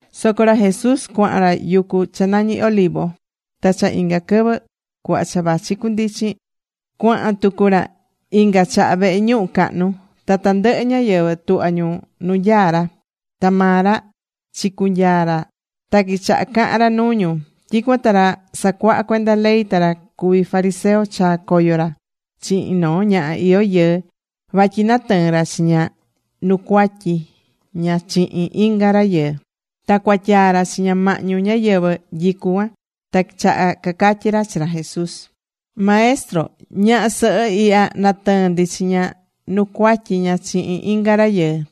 Soco ra Jesús cuahan ra yucu cha nañi Olivo. Ta cha inga quɨvɨ cuhva cha vachi cundichin, cuahan tucu ra inga chaha vehe ñuhu cahnu. Ta tandɨhɨ ñáyɨvɨ tuhva̱ ñu nu nyaá ra. Ta maa ra chicunyaa̱ ra ta quichaha cahan ra nuu ñu. Tyicuan ta ra sacuahá cuenda ley ta ra cuví fariseo chaa̱ coyo ra chihin noo ñaha iyó yɨɨ vatyi natɨɨ̱n ra chi ña nu cuatyi ña chihin inga rayɨɨ. Ta cuatyaa ra chi ña mahñu ñáyɨvɨ nyicú cuan. Ta quichaha cacatyí ra chi ra Jesús: ―Maestro, ñaha sɨhɨ ihya natɨɨ̱n ndi chi ña nu cuatyi ña chihin inga rayɨɨ.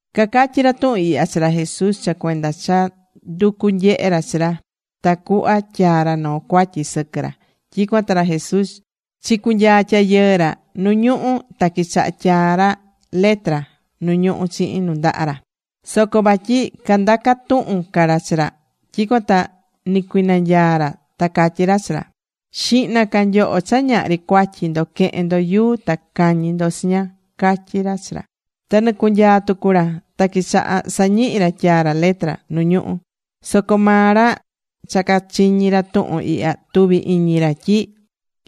Cacatyi̱ ra tuhun ihya chi ra Jesús cha cuenda cha nducú nyehe ra chi ra tacuhva tyaa ra noo cuatyi sɨquɨ ra. Tyicuan ta ra Jesús chicunyaa̱ tyayɨɨ ra nu ñuhú ta quichaha̱ tyaa ra letra nu ñuhú chihin nundaha ra. Soco vatyi candacá tuhun ca ra chi ra, tyicuan ta nicuinanyaa̱ ra ta catyí ra chi ra: ―Xihna ca nyoho cha ñahri cuatyi ndo que̱hen ndo yuu ta ca̱ñi ndo chi ña ―catyí ra chi ra. Ta nicunyaa̱ tucu ra ta quichaha sañihi ra tyaa ra letra nu ñuhú. Soco maa ra cha cachiñi̱ ra tuhun ihya, tuvi̱ iñi ra tyi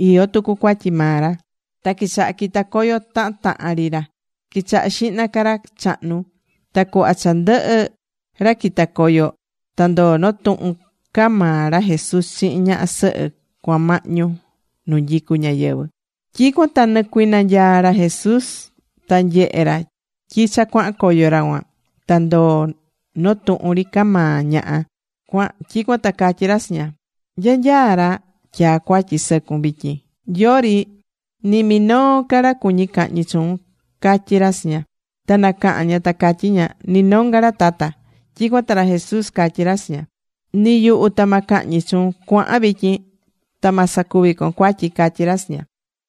iyó tucu cuatyi maa ra. Ta quichaha quita coyo tahan tahan ri ra, quichaha xihna ca ra chahnu. Ta cuhva cha ndɨhɨ ra quita̱ coyo ta ndoo̱ noo tuhun ca maa ra Jesús chihin ñaha sɨhɨ cuan mahñu nu nyicu ñáyɨvɨ. Tyicuan ta nicuinanyaa̱ ra Jesús ta nyehe ra tyi cha cuahan coyo ra cuan ta ndoo̱ noo tuhun ri ca ñaha. Tyicuan ta catyí ra chi ña: ―¿Nya nyaá ra tyaa̱ cuatyi sɨcun vityin? ¿Yori ni minoo ca ra cuñí cahñi chuun? ―catyí ra chi ña. Ta nacaha̱n ña ta catyí ña: ―Ni nonga ra, Tata. Tyicuan ta ra Jesús catyí ra chi ña: ―Ni yuhu ta ma cahñi chuun. Cua̱han vityin. Ta ma sacuvi con cuatyi ―catyí ra chi ña.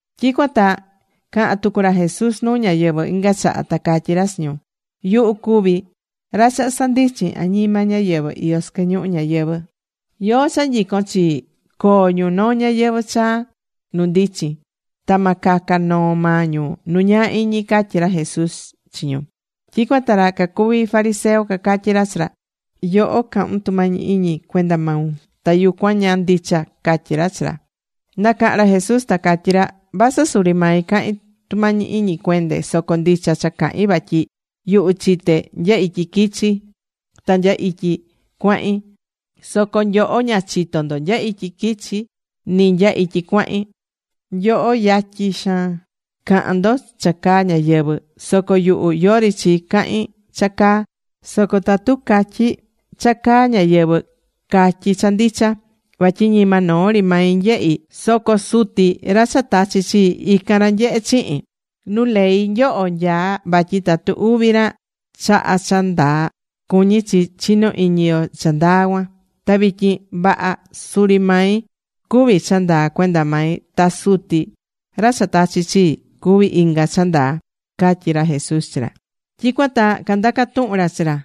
Tyicuan ta caha̱n tucu ra Jesús nuu ñáyɨvɨ inga chaha, ta catyí ra chi ñu: ―Yuhu cuví ra cha sandichin añima ñáyɨvɨ iyó sɨquɨ ñuhu ñayɨvɨ̱. Yóó cha nyicón chii, coo ñu noo ñayɨvɨ̱ chaa nu ndichin. Ta ma caca noo maa ñu nu ñaa iñi ―catyí ra Jesús chi ñu. Tyicuan ta ra cacuví fariseo cacatyí ra chi ra: ―Yoho, cahún tumañi iñi cuenda maun. Ta yucuan ña ndicha ―catyí ra chi ra. Nacaha̱n ra Jesús ta catyí ra: ―Vasɨ suri mai cahín tumañi iñi cuende, soco ndicha cha cahin vatyi yuhu chité nya ityi quichi̱ ta nya ityi cuahín. Soco nyoho ña chitó ndo nya ityi quichi̱ ni nya ityi cuahín. Nyoho yatyin xaan cahan ndo cha caa ñáyɨvɨ. Soco yuhu, yori chi cahin cha caa. Soco tatu catyi cha caa ñáyɨvɨ, catyí cha ndicha. Vatyi ñima noo ri mai nyehí, soco Suti ra cha tachi chii, ican ra nyehé chihin. Nu ley nyoho nyaá vatyi tatu uvi ra chaha cha ndaa, cuñí chi chinó iñi yo cha ndaa cuan. Ta vityin vaha, suri mai cuví cha ndaa cuenda mai. Ta Suti, ra cha tachi̱ chii, cuví inga cha ndaa ―catyí ra Jesús chi ra. Tyicuan ta candaca̱ tuhun ra chi ra: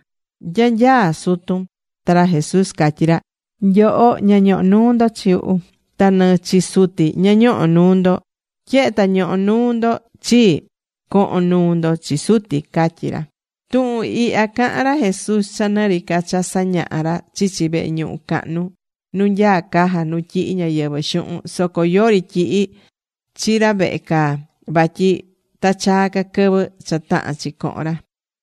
―¿Nya nyaá sutun? Ta ra Jesús catyí ra: ―Nyoho ña ñohó nuu ndo chi yuhu. Ta ni chi Suti ña ñohó nuu ndo. Tyehe ta ñohó nuu ndo chii, cohon nuu ndo chi Suti ―catyí ra. Tuhun ihya caha̱n ra Jesús cha nɨ ri ca cha sañahá ra chichi vehe ñuhu cahnu, nu nyaá caja nu tyihí ñáyɨvɨ xuhun. Soco yori tyihi̱ chi ra vehe caa, vatyi ta chaa ca quɨvɨ cha tahán chi cohon ra.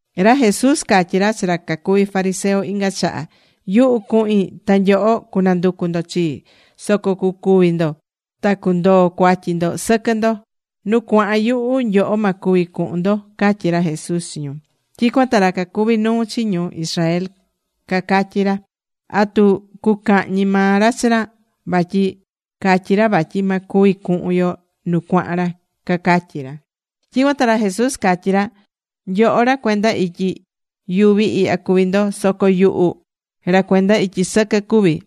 Ra Jesús catyí ra chi ra cacuvi fariseo inga chaha: ―Yuhu cuhin, ta nyoho cunanducu ndo chii, soco cucúvi ndo ta cundoo cuatyi ndo sɨquɨ ndo. Nu cuahan yuhu, nyoho ma cuvi cuhun ndo ―catyí ra Jesús chi ñu. Tyicuan ta ra cacuví nuu chi ñu Israel cacatyí ra: ―¿Atu cucahñi maa ra chi ra? vatyi catyí ra vatyi ma cuvi cuhun yo nu cuahan ra ―cacatyí ra. Tyicuan ta ra Jesús catyí ra: ―Nyoho ra cuenda ityi yuvi ihya cuví ndo. Soco yuhu ra cuenda ityi sɨquɨ cuví.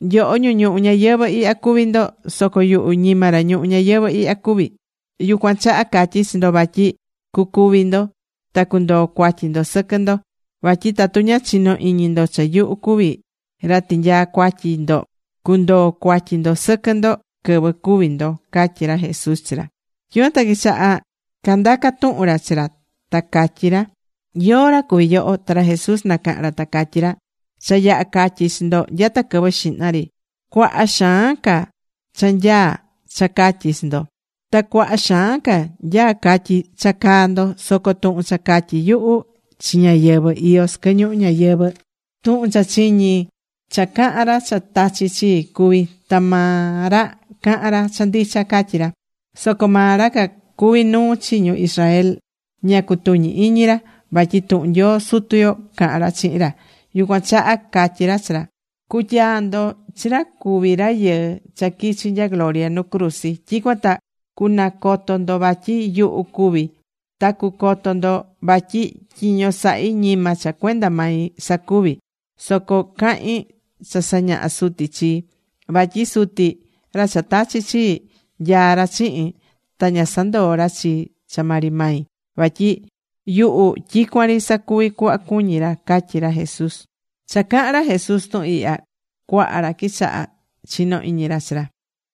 Nyoho ñu ñuhu ñayɨvɨ̱ ihya cuví ndo. Soco yuhu ñima ra ñuhu ñayɨvɨ̱ ihya cuví. Yucuan chaha catyí chi ndo vatyi cucúvi ndo ta cundoo cuatyi ndo sɨquɨ ndo. Vatyi tatu ña chinó iñi ndo cha yuhu cuví ra tinyaá cuatyi ndo, cundoo cuatyi ndo sɨquɨ ndo quɨvɨ cúvi ndo ―catyí ra Jesús chi ra. Tyicuan ta quichaha candaca̱ tuhun ra chi ra, ta catyí ra: ―¿Yóó ra cuví yoho? Ta ra Jesús nacaha̱n ra ta catyí ra: ―Cha yaha catyi̱ chi ndo nyata quɨvɨ xihna ri. Cuaha xaan ca cha nyaá cha catyi chi ndo, ta cuaha xaan ca nyaá catyi cha caá ndo. Soco tuhun cha catyí yuhu chi ñáyɨvɨ iyó sɨquɨ ñuhu ñayɨvɨ̱, tuhun cha chiñi̱ cha cahán ra cha tachi̱ chii cuví. Ta maa ra cahán ra cha ndicha ―catyí ra. Soco maa ra cacuví nuu chi ñu Israel ña cutuñi̱ iñi ra vatyi tuhun Nyoo Sutu yo cahán ra chihin ra. Yucuan chaha catyi̱ ra chi ra: ―Cutyaa ndo chi ra cuví Rayɨɨ cha quichi nya gloria nu cruzi. Tyicuan ta cunacoto ndo vatyi yuhu cuví, ta cucoto ndo vatyi tyiño sahí ñima cha cuenda mai sacuví, soco cahín cha sañahá Suti chii. Vatyi Suti, ra cha tachi̱ chii, nyaá ra chihin. Ta ña sandoó ra chii cha maa ri mai. Vatyi yuhu tyicuan ri sacuví cuhva cuñí ra ―catyí ra Jesús. Cha cahán ra Jesús tuhun ihya, cuaha ra quichaha chino iñi ra chi ra.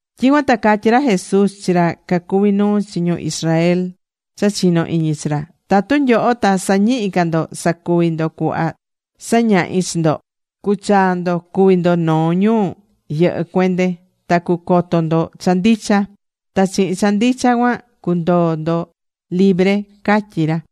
Tyicuan ta catyí ra Jesús chi ra cacuvi nuu chi ñu Israel cha chinó iñi chi ra: ―Tatu nyoho ta sañihi ca ndo sacuvi ndo cuhva sañahí chi ndo, cuchaa ndo cuví ndo noo ñu yɨhɨ cuende. Ta cucoto ndo cha ndicha. Ta chihin cha ndicha cuan cundoo ndo libre ―catyí ra.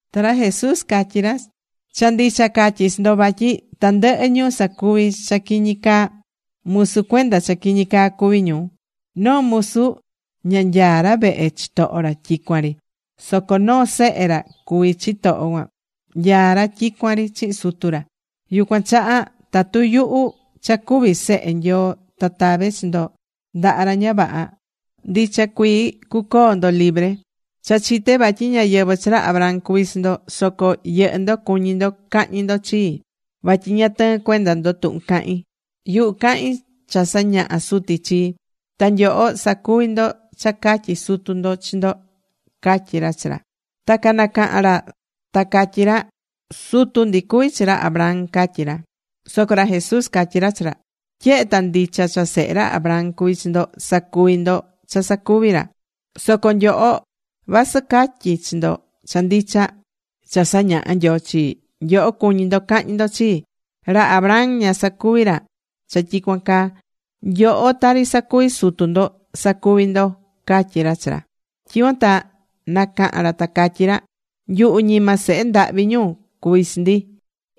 Ta ra Jesús catyí ra: ―Cha ndicha catyí chi ndo vatyi tandɨhɨ ñu sacuví cha quiñi caa, musu cuenda cha quiñi caa cuví ñu. Noo musu ña nyaá ra vehe chitoho ra tyicuan ri. Soco noo sehe ra cuví chitoho cuan, nyaá ra tyicuan ri chihin sutu ra. Yucuan chaha tatu yuhu cha cuví Sehe Nyoo ta tave chi ndo ndaha ra ña vaha, ndicha cuii cucoo ndo libre. Cha chité vatyi ñáyɨvɨ chi ra Abraham cuví chi ndo. Soco yɨhɨ́ ndo cuñí ndo cahñi ndo chii, vatyi ña tɨɨ́n cuenda ndo tuhun cahin. Yuhu cahín cha sañaha̱ Suti chii. Ta nyoho sacuví ndo cha catyi̱ sutu ndo chi ndo ―catyí ra chi ra. Ta canacaha̱n ra ta catyí ra: ―Sutu ndi cuví chi ra Abraham ―catyí ra. Soco ra Jesús catyí ra chi ra: ―Tyehe ta ndicha cha sehe ra Abraham cuví chi ndo, sacuví ndo cha sacuvi̱ ra. Soco nyoho, vasɨ catyí chi ndo cha ndicha cha sañaha̱ Nyoo chii, nyoho cuñí ndo cahñi ndo chii. ¡Ra Abraham ña sacuvi̱ ra cha tyicuan caa! Nyoho tari sacuví sutu ndo, sacuví ndo ―catyí ra chi ra. Tyicuan ta nacaha̱n ra ta catyí ra: ―Nyuhu ñima sehe ndahvi ñu cuví chi ndi.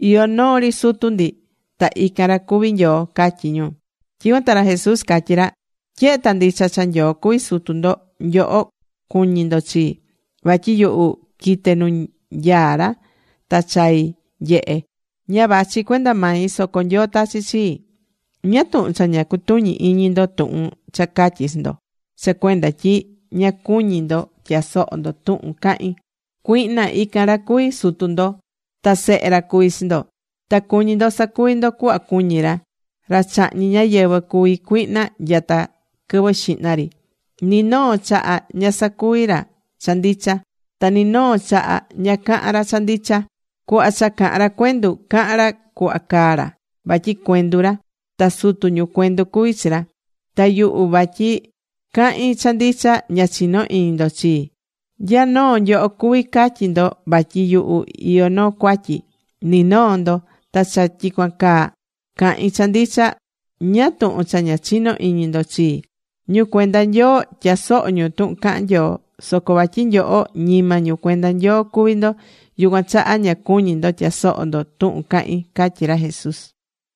Iyó noo ri sutu ndi ta ican ra cuví Nyoo ―catyí ñu. Tyicuan ta ra Jesús catyí ra: ―Tyehe ta ndicha cha Nyoo cuví sutu ndo, nyoho cuñí ndo chii. Vatyi yuhu quite̱ nu nyaá ra ta chai̱ nyehe. Ña vachí cuenda mai, soco Nyoo tachi̱ chii. ¿Ñáá tuhun cha ña cutuñí iñi ndo tuhun cha catyí chi ndo? Cha cuenda tyi ña cuñí ndo tyasohó ndo tuhun cahín. Cuihna ican ra cuví sutu ndo. Ta sehe ra cuví chi ndo. Ta cuñí ndo sacuvi ndo cuhva cuñí ra. Ra chahñí ñáyɨvɨ cuví cuihna nyata quɨvɨ xihna ri. Ni noo chaha ña sacuví ra cha ndicha. Ta ni noo chaha ña cahán ra cha ndicha. Cuhva cha cahán ra cuendu, cahán ra cuhva caá ra, vatyi cuendu ra. Ta sutu ñu cuendu cuví chi ra. Ta yuhu vatyi cahín cha ndicha, ña chinó iñi ndo chii. ¿Nya noo nyoho cuví catyi ndo vatyi yuhu iyó noo cuatyi? Ni noo ndo. Ta cha tyicuan caa cahín cha ndicha, ¿ñáá tuhun cha ña chinó iñi ndo chii? Ñu cuenda Nyoo tyasohó ñu tuhun cahán Nyoo. Soco vatyi nyoho ñima ñu cuenda Nyoo cuví ndo, yucuan chaha ña cuñí ndo tyasoho ndo tuhun cahín ―catyí ra Jesús.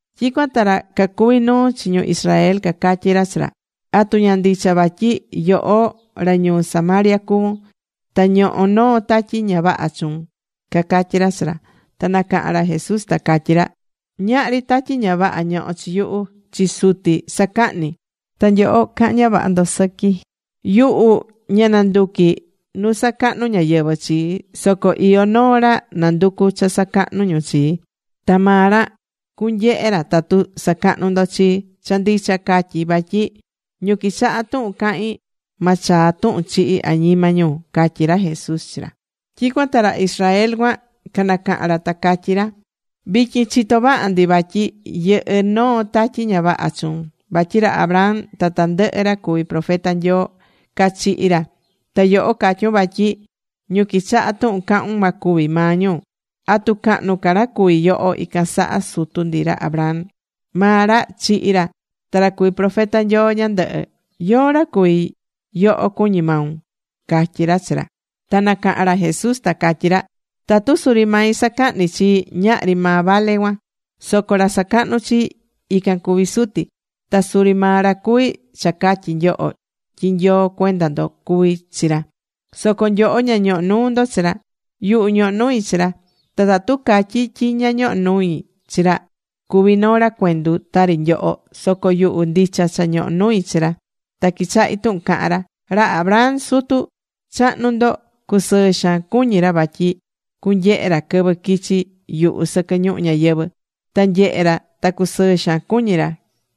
Tyicuan ta ra cacuvi nuu chi ñu Israel cacatyí ra chi ra: ―¿Atu ña ndicha vatyi yoho ra ñuu Samaria cuvún, ta ñohó noo tatyi ña vaha chuun? ―cacatyí ra chi ra. Ta nacaha̱n ra Jesús ta catyí ra: ―Ñahri tatyi ña vaha ñohó chi yuhu. Chi Suti sacahní. Ta nyoho cahán ña vaha ndo sɨqui. Yuhu ña nanduquí nu sacahnu ñáyɨvɨ chii, soco iyó noo ra nanducú cha sacahnu ñu chii. Ta maa ra cunyehe ra tatu sacahnú ndo chii. Cha ndicha catyí vatyi ñu quichahá tuhun cahín ma chaa tuhun chihi añima ñu ―catyí ra Jesús chi ra. Tyicuan ta ra Israel cuan canacaha̱n ra ta catyí ra: ―Vityin chitó vaha ndi vatyi yɨhɨ́ noo tatyi ña vaha chuun. Vatyi ra Abraham ta tandɨhɨ ra cuví profeta Nyoo cachihi̱ ra. Ta yoho catyún vatyi ñu quichahá tuhun cahún ma cúvi maa ñu. ¿Atu cahnu ca ra cuví yoho ican saha sutu ndi ra Abraham? Maa ra chihi̱ ra ta ra cuví profeta Nyoo ñandɨhɨ. ¿Yóó ra cuví yoho cuñí maun? ―catyí ra chi ra. Ta nacaha̱n ra Jesús ta catyí ra: ―Tatu suri mai sacahní chii, ñahri maa vale cuan. Soco ra sacahnú chii, ican cuví Suti. Ta suri maa ra cuví cha catyí nyoho tyi Nyoo cuenda ndo cuví chi ra. Soco nyoho ña ñohó nuu ndo chi ra. Yuhu, ñohó nui chi ra. Ta tatu catyí tyi ña ñohó nui chi ra, cuví noo ra cuendu tari nyoho. Soco yuhu ndicha cha ñohó nui chi ra, ta quichahí tuhun cahán ra. Ra Abraham sutu chahnu ndo cusɨɨ xaan cuñi̱ ra vatyi cunyehe ra quɨvɨ quichi yuhu sɨquɨ ñuhu ñayɨvɨ̱. Ta nyehe̱ ra ta cusɨɨ xaan cuñí ra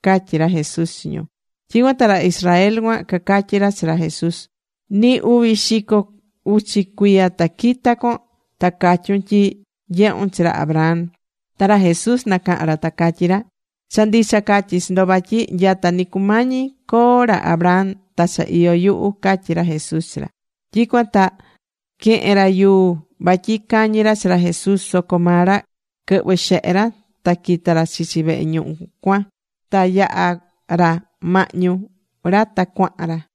―catyí ra Jesús chi ñu. Tyicuan ta ra Israel cuan cacatyí ra chi ra Jesús: ―Ni uvi xico uchi cuiya ta quita con, ta catyún tyi nyehu̱n chi ra Abraham. Ta ra Jesús nacaha̱n ra ta catyí ra: ―Cha ndicha catyí chi ndo vatyi nyata ni cumañi coo ra Abraham ta cha iyó yuhu ―catyí ra Jesús chi ra. Tyicuan ta quehe̱n ra yuu vatyi cañi ra chi ra Jesús. Soco maa ra quɨhvɨ̱ xehe ra, ta quita̱ ra chichi vehe ñuhu cuan. Ta yaha̱ ra mahñu ra ta cuahan ra.